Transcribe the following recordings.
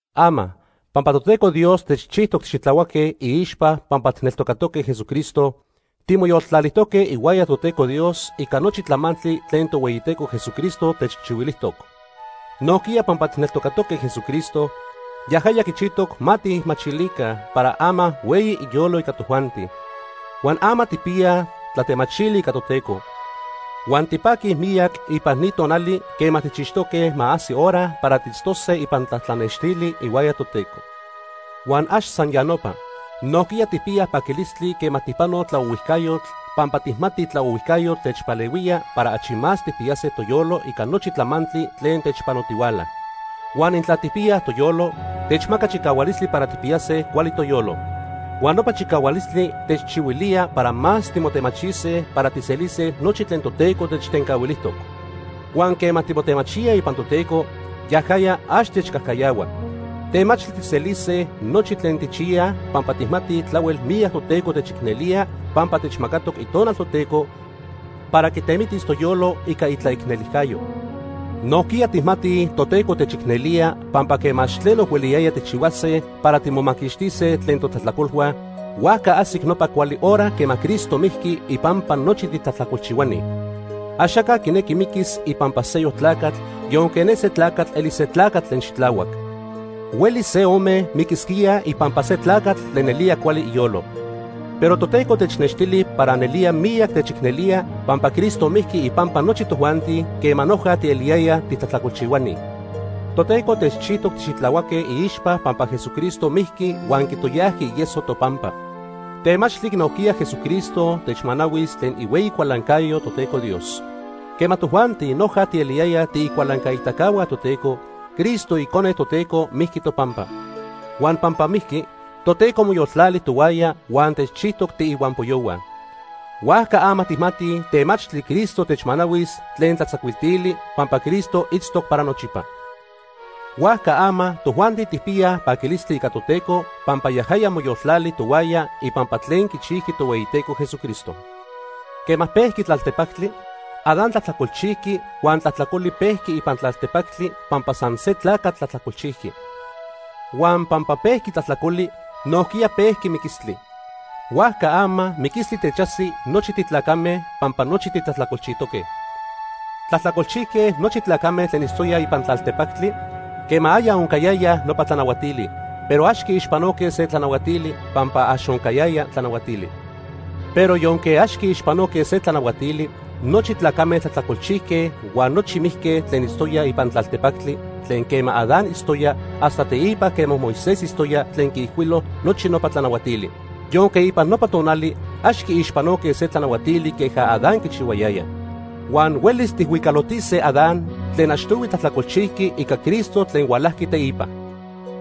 Ama, pampa Toteco Dios techchijtoc tixitlahuaque iixpa pampa tijneltocaque Jesucristo, timoyoltlalijtoque ihuaya Toteco Dios ica nochi tlamantli tlen Tohueyiteco Jesucristo techchihuilijtoc. Nojquiya pampa tijneltocatoque Jesucristo, yajaya quichijtoc ma tijmachilica para ama hueyi iyolo ica tojuanti. Huan ama tijpiyaj tlatemachili ica Toteco. Huan tipaquij miyac ipan ni tonali quema tijchixtoque ma ajsi hora para tiitztose ipan tlatlanextli ihuaya Toteco. Huan ax san ya nopa, nojquiya tijpiyaj paquilistli quema tijpanoj tlaohuijcayotl, pampa tijmatij tlaohuijcayotl techpalehuía para achi más tijpiyase toyolo ica nochi tlamantli tlen techpanotihuala. Huan intla tijpiyaj toyolo, techmaca chicahualistli para tijpiyase cuali toyolo. Huan nopa chicahualistli techchihuilía para más timotemachise para tijselise nochi tlen Toteco techtencahuilijtoc. Huan quema timotemachíaj ipan Toteco, yajaya ax techcajcayahua. Temachtli tijselise nochi tlen tijchiyaj pampa tijmatij tlahuel miyac Toteco techicnelía pampa techmacatoc Itonal Toteco para quitemitis toyolo ica itlaicnelijcayo. Nojquiya tijmatij Toteco techicnelía pampa quema ax tleno hueliyaya tijchihuase para timomaquixtise tlen totlajtlacolhua, huajca ajsic nopa cuali hora quema Cristo mijqui ipampa nochi titlajtlacolchihuani. Axaca quinequi miquis ipampa seyoc tlacatl yonque ne se tlacatl elis se tlacatl tlen xitlahuac. Huelis se ome miquisquíaj ipampa se tlacatl tlen nelía cuali iyolo. Pero Toteco technextili para nelía miyac techicnelía pampa Cristo mijqui ipampa nochi tojuanti quema noja tieliyayaj titlajtlacolchihuani. Toteco techchijtoc tixitlahuaque iixpa pampa Jesucristo mijqui huan quitoyajqui ieso topampa, temachtli nojquiya Jesucristo techmanahuis tlen ihueyi cualancayo Toteco Dios. Quema tojuanti noja tieliyayaj tiicualancaitacahua Toteco, Cristo icone Toteco mijqui topampa. Huan pampa mijqui, Toteco moyoltlali tohuaya huan techchijtoc tiihuampoyohua. Huajca ama tijmatij temachtli Cristo techmanahuis tlen tlatzacuiltili pampa Cristo itztoc para nochipa. Huajca ama tojuanti tijpiyaj paquilistli ica Toteco pampa yajaya moyoltlali tohuaya ipampa tlen quichijqui Tohueyiteco Jesucristo. Quema pejqui tlaltepactli, Adán tlajtlacolchijqui huan tlajtlacoli pejqui ipan tlaltepactli pampa san se tlacatl tlajtlacolchijqui. Huan pampa pejqui tlajtlacoli, nojquiya pejqui miquistli. Huajca ama miquistli techajsi nochi titlacame, pampa nochi titlajtlacolchijtoque. Tlajtlacolchijque nochi tlacame tlen itztoyaj ipan tlaltepactli quema aya oncayayaj nopa tlanahuatili, pero ax quiixpanoque se tlanahuatili pampa ax oncayaya tlanahuatili. Pero yonque ax quiixpanoque se tlanahuatili, nochi tlacame tlajtlacolchijque huan nochi mijque tlen itztoyaj ipan tlaltepactli tlen quema Adán itztoya hasta teipa quema Moisés itztoya tlen quiijcuilo nochi nopa tlanahuatili, yonque ipan nopa tonali ax quiixpanoque se tlanahuatili queja Adán quichihuayayaj. Huan huelis tijhuicalotise Adán tlen achtohui tlajtlacolchijqui ica Cristo tlen hualajqui teipa.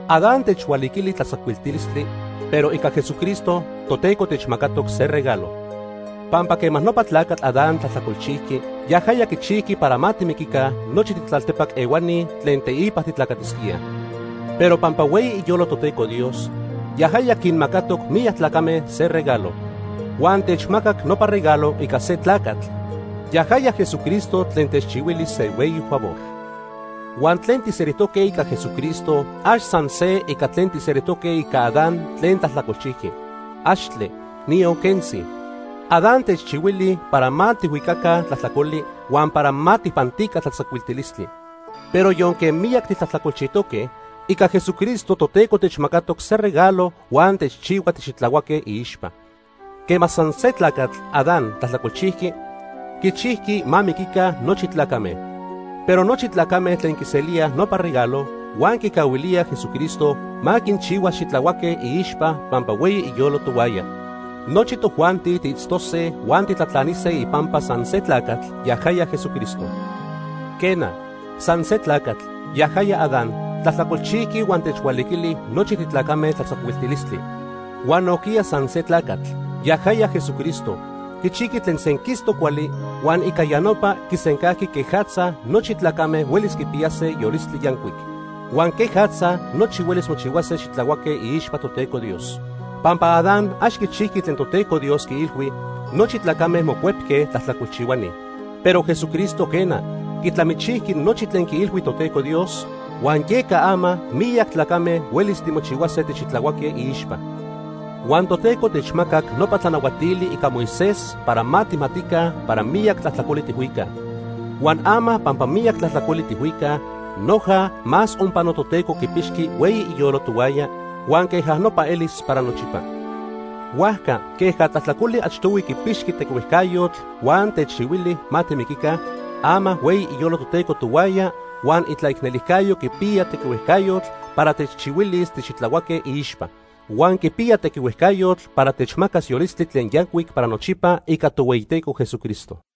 Adán techhualiquili tlatzacuiltilistli, pero ica Jesucristo, Toteco techmacatoc se regalo. Pampa quema nopa tlacatl Adán tlajtlacolchijqui, yajaya quichijqui para ma timiquica nochi titlaltepac ehuani tlen teipa titlacatisquíaj. Pero pampa hueyi iyolo Toteco Dios, yajaya quinmacatoc miyac tlacame se regalo. Huan techmacac nopa regalo ica se tlacatl, yajaya Jesucristo tlen techchihuili se hueyi favor. Huan tlen tijselijtoque ica Jesucristo ax san se ica tlen tijselijtoque ica Adán tlen tlajtlacolchijqui. ¡Axtle, niyon quentzi! Adán techchihuili para ma tijhuicaca tlajtlacoli, huan para ma tijpantica tlatzacuiltilistli. Pero yonque miyac titlajtlacolchijtoque, ica Jesucristo Toteco techmacatoc se regalo huan techchihua tixitlahuaque iixpa. Quema san se tlacatl, Adán, tlajtlacolchijqui, quichijqui ma miquica nochi tlacame. Pero nochi tlacame tlen quiselíaj nopa regalo huan quicahuilíaj Jesucristo ma quinchihuas xitlahuaque iixpa pampa hueyi iyolo tohuaya, nochi tojuanti tiitztose huan titlatlanise ipampa san se tlacatl, yajaya Jesucristo. Quena, san se tlacatl, yajaya Adán, tlajtlacolchijqui huan techhualiquili nochi titlacame tlatzacuiltilistli. Huan nojquiya san se tlacatl, yajaya Jesucristo, quichijqui tlen senquistoc cuali huan ica ya nopa quisencajqui quejatza nochi tlacame huelis quipiyase yolistli yancuic, huan quejatza nochi huelis mochihuase xitlahuaque iixpa Toteco Dios. Pampa Adán ax quichijqui tlen Toteco Dios quiilhui, nochi tlacame mocuepque tlajtlacolchihuani, pero Jesucristo quena, quitlamichijqui nochi tlen quiilhui Toteco Dios, huan yeca ama miyac titlacame huelis timochihuase tixitlahuaque iixpa. Huan Toteco techmacac nopa tlanahuatili ica Moisés para ma tijmatica para miyac tlajtlacoli tijhuicaj. Huan ama pampa miyac tlajtlacoli tijhuicaj, noja más onpano Toteco quipixqui hueyi iyolo tohuaya, huan queja nopa elis para nochipa. Huajca queja tlajtlacoli achtohui quipixqui tequihuejcayotl huan techchihuili ma timiquica, ama hueyi iyolo Toteco tohuaya huan itlaicnelijcayo quipiya tequihuejcayotl para techchihuilis tixitlahuaque iixpa. Huan quipiya tequihuejcayotl para techmacas yolistli tlen yancuic para nochipa ica Tohueyiteco Jesucristo.